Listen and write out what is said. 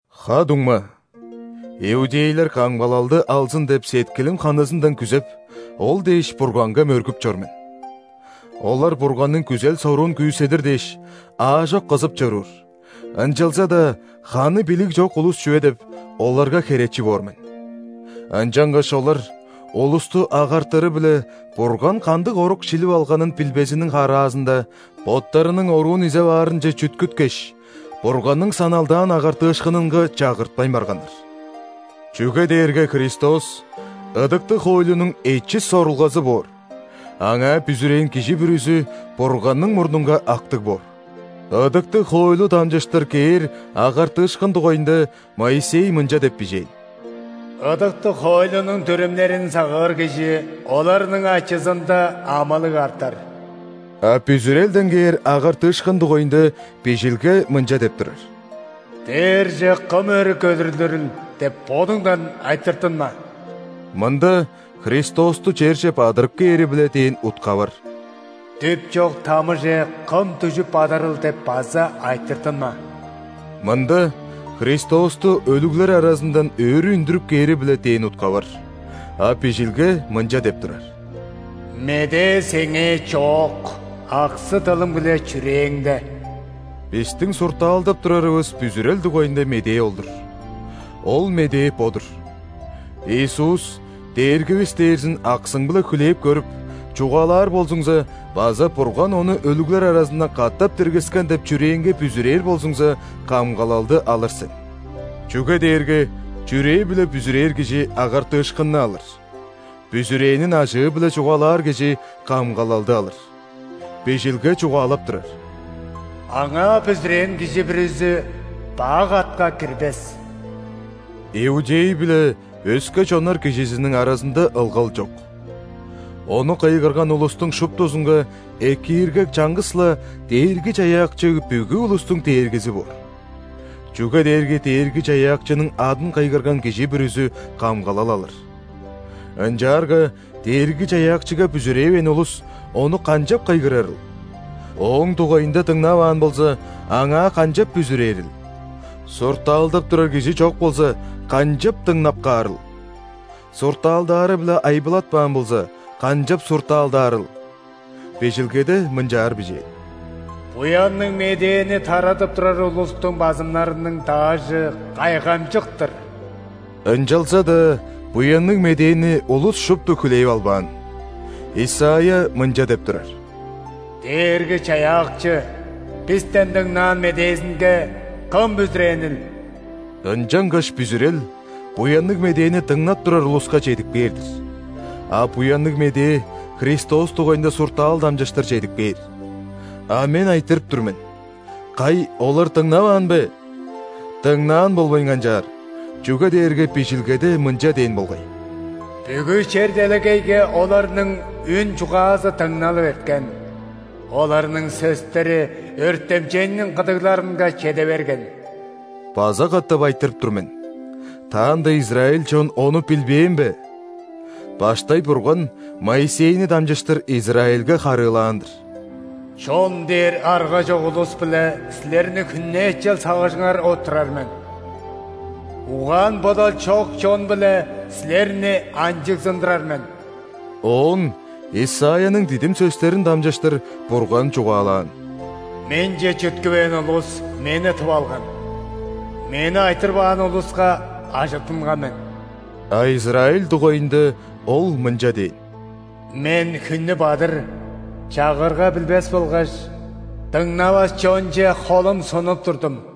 Ха-дуңма, иудейлер камгалалды алзын деп сеткилим ханызындан күзеп, ол дээш Бурганга мөргүп чор мен. Олар Бурганның күзел-соруун күүседир дээш, аажок кызып чоруур, ынчалза-даа ханы билиг чок улус чүве деп, оларга херечи боор мен. Ынчангаш олар, улусту агартыры-биле Бурган кандыг орук шилип алг��нын билбезиниң хараазында, боттарының оруун изеп аарынче чүткүткеш, Бурганның саналдаан агартыышкынынга чагыртпайн барганнар. Чүге дээрге Христос – ыдыктыг хоойлунуң эчис сорулгазы боор, Аңаа бүзүрээн кижи бүрүзү Бурганның мурнунга актыг боор. Ыдыктыг хоойлу дамчыштыр кээр агартыышкын дугайында Моисей мынча деп бижээн: «Ыдыктыг хоойлунуң дүрүмнерин сагыыр кижи оларның ачызында амылыг артар». А бүзүрелден кээр агартыышкын дугайында Бижилге мынча деп турар: «„Дээрже кым өрү көдүрлүрүл?“ – деп бодуңдан айтыртынма» (мында Христосту черже бадырып кээри-биле дээн утка бар). «„Дүп чок тамыже кым дүжүп бадарыл?“ – деп база айтыртынма» (мында Христосту өлүглер аразындан өрү үндүрүп кээри-биле дээн утка бар). А Бижилге мынча деп турар: «Медээ сеңээ чоок – аксы-дылың биле чүрээңде» (бистиң суртаалдап турарывыс бүзүрел дугайында медээ ол-дур). Ол медээ бо-дур: Иисус – Дээргивис дээрзин аксың-биле хүлээп көрүп, чугаалаар болзуңза база Бурган Ону өлүглер аразындан катап диргискен деп чүрээңге бүзүрээр болзуңза, камгалалды алыр сен. Чүге дээрге чүрээ-биле бүзүрээр кижи – агартыышкынны алыр, бүзүрээнин ажыы-биле чугаалаар кижи – камгалалды алыр. Бижилге чугаалап турар: «Аңаа бүзүрээн кижи бүрүзү бак атка кирбес». Иудей биле өске чоннар кижизиниң аразында ылгал чок. Ону кыйгырган улустуң шуптузунга экииргек чаңгыс-ла Дээрги-Чаяакчы бүгү улустуң Дээргизи боор. Чүге дээрге Дээрги-Чаяакчының адын кыйгырган кижи бүрүзү камгалал алыр. Ынчаарга Дээрги-Чаяакчыга бүзүревээн улус Ону канчап кыйгырарыл? Ооң дугайында дыңнаваан болза, Аңаа канчап бүзүрээрил? Суртаалдап турар кижи чок болза, канчап дыңнап каарыл? Суртаалдаары-биле айбылатпаан болза, канчап суртаалдаарыл? Бижилгеде мынчаар бижээн: «Буянныг Медээни тарадып турар улустуң базымнарының даажы кайгамчык-тыр!» Ынчалза-даа Буянныг Медээни улус шупту хүлээп албаан. Исайя мынча деп турар: «Дээрги-Чаяакчы, бистен дыңнаан медээзинге кым бүзүрээнил?» Ынчангаш бүзүрел Буянныг Медээни дыңнап турар улуска чедип кээр-дир. А Буянныг Медээ Христос дугайында суртаал дамчыштыр чедип кээр. А мен айтырып тур мен: кай, олар дыңнаваан бе? Дыңнаан болбайн канчаар! Чүге дээрге Бижилгеде мынча дээн болгай:«Бүгү чер-делегейге оларның үн-чугаазы дыңналып эрткен,оларның сөстери өртемчейниң кыдыгларынга чеде берген». База катап айтырып тур мен: таанда израиль чон ону билбээн бе? Баштай Бурган Моисейни дамчыштыр Израильге харыылаан-дыр:«Чон дээр арга чок улус-биле силерниң хүннээчел сагыжыңар оттурар мен;угаан-бодал чок чон-биле силерни анчыгзындырар мен». Оон Исайяның дидим сөстерин дамчыштыр Бурган чугаалаан:«Менче чүткүвээн улус Мени тып алган;Мени айтырбаан улуска ажыттынган мен». А Израиль дугайында Ол мынча дээн:«Мен хүннү бадыр чагырга билбес болгаш дыңнавас чонче холум сунуп турдум».